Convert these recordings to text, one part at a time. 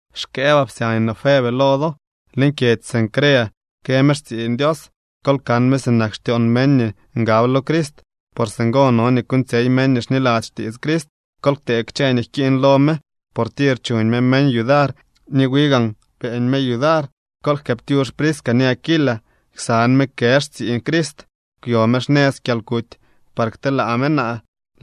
Xkëëbaa psyañ no Febe lo do. Leñ kyedzy Cencrea kë me xtsiiñ Dios. Kol kan me sinak xtyoon meñ nii ngab lo Crist, por singo no nii kuuñtsyey meñ nii xniladzy xtiits Crist. Kol ktee kchë nii jkiiñ lo me, por tir chuñ me meñ yudar ni wi gaan beeñ me yudar. Kol jkëëptyux Prisca ni Aquila. Ksan me kë xtsiiñ Crist. Kwyo me xnëz kyalkuty par kteelaa me naa.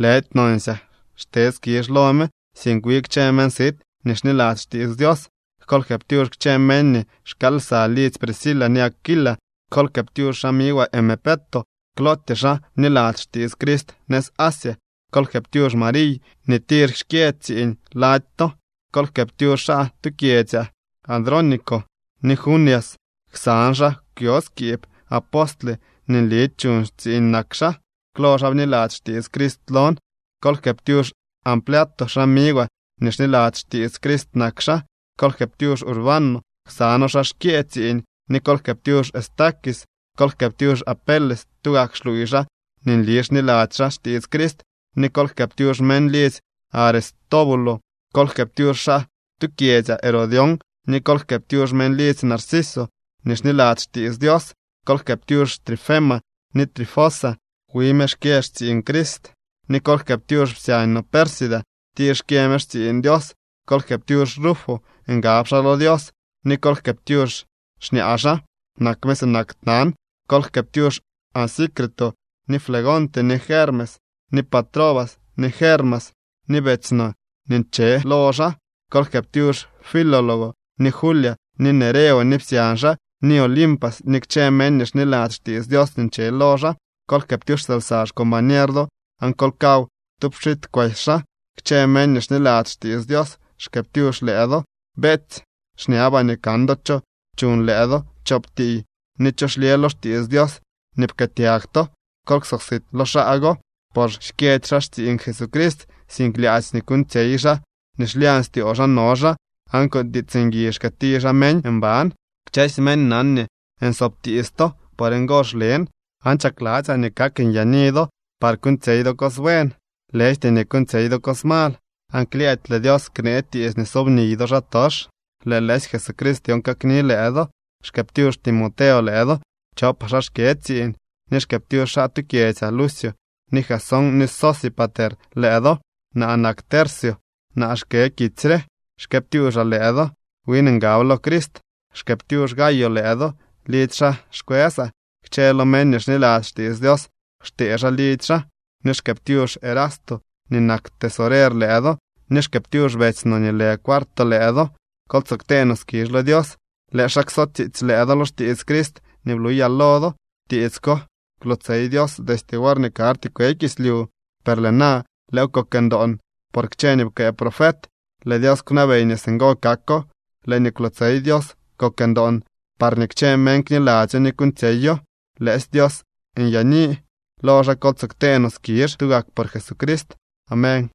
Lëdy nonsyaa xte skizh lo me, sink wi kchë meñ sit nii xniladzy xtiits Dios. Kol jkëëptyux kchë meñ nii xkaal lsa lidzy Prisca ni Aquila. Kol jkëëptyux xamigwaa Epeneto. Klootyee xaa bniladzy xtiits Crist nëz Asia. Kol jkëëptyux Mariy nii tir xkyë tsiiñ lady to. Kol jkëëptyux xaa tu kyedzyaa Andrónico ni Junias. Ksan xaa kwyo skiib. Apostle nii nli chuñ tsiiñ nak xaa. Klo xaa bniladzy xtiits Crist lon. Kol jkëëptyux Ampliato. Xamigwaa nii xniladzy xtiits Crist nak xaa. Kol jkëëptyux Urbano. Ksa noo xaa xkyëë tsiiñ. Ni kol jkëëptyux Estaquis. Kol jkëëptyux Apeles. Tugak xluuy xaa nii nli xniladzy xaa xtiits Crist. Ni kol jkëëptyux meñ lidzy Aristóbulo. Kol jkëëptyux xaa tu kyedzyaa Herodión, ni kol jkëëptyux meñ lidzy Narciso nii xniladzy xtiits Dios. Kol jkëëptyux Trifena ni Trifosa. Wi me xkyë xtsiiñ Crist. Ni kol jkëëptyux psyañ no Pérsida. Tir xkyë me xtsiiñ Dios. Kol jkëëptyux Rufo. Ngab xaa lo Dios. Ni kol jkëëptyux xñaa xaa. Nak me sinak tnan. Kol jkëëptyux Asíncrito, ni Flegonte, ni Hermes, ni Patrobas, ni Hermas ni betsy no nii nche lo xaa. Kol jkëëptyux Filólogo, ni Julia, ni Nereo ni psyañ xaa, ni Olimpas ni kchë meñ nii xniladzy xtiits Dios nii nche lo xaa. Kol jkëëptyux lsa xcombañer do aan kol kaw tu pxit kwesy xaa. Kchë meñ nii xniladzy xtiits Dios xkëëptyux lëë do. Beetsy, xñabaa nii kan do cho chuñ lëë do chop tiiy ni cho xlyë lo xtiits Dios nii pkëëtyag to. Kol ksosit lo xaa go, por xkyëdy xaa xtsiiñ Jesucrist, sink lyaadzy nii kuuñtsyey xaa nii xlyañ styoo xaa no xaa, aan con tiits ngui xkëëti xaa meñ mban. Kchësy meñ nan nii nsoob tiits to. Por ngo xlen. Aan chakladzyaa nii kak nyaani do par kuuñtsyey do cos buen, lëjty nii kuuñtsyey do cos mal. Aan klyëëdy lëë Dios knee tiits nii sobniy do xaatox. Lëë lëësy Jesucrist dyon kakni lëë do. Xkëëptyux Timoteo lëë do. Chopaa xaa xkyë tsiiñ. Ni xkëëptyux xaa tu kyedzyaa Lucio ni Jasón ni Sosípater lëë do. Naa nak Tercio. Naa xkë kitsy re. Xkëëptyuuxaa lëë do. Win ngab lo Crist. Xkëëptyux Gayo lëë do. Lidzy xaa xkwësaa. Kchë lo meñ nii xniladzy xtiits Dios xtee xaa lidzy xaa. Ni xkëëptyux Erasto nii nak tesorer lëë do, ni xkëëptyux betsy no nii lë Cuarto lëë do. Kol tsoo ktee no skizh lo Dios. Lëë xaa kso tsiitsy lëë do lo xtiits Crist nii bluyaa lo do. Tiits ko kwlootsey Dios destye worñee karty kwe kislyu, per lëë na lëëw kok ndoon por kchë nii pkëë profet. Lëë Dios kwnabey nii singo kako. Lëë nii kwlootsey Dios kok ndoon parñee kchë meñ kniladzyo ni kuuñtsyeyo. ¡Lëësy Dios nyaani! ¡Lo xaa kol tsoo ktee no skizh tugak por Jesucrist! Amén.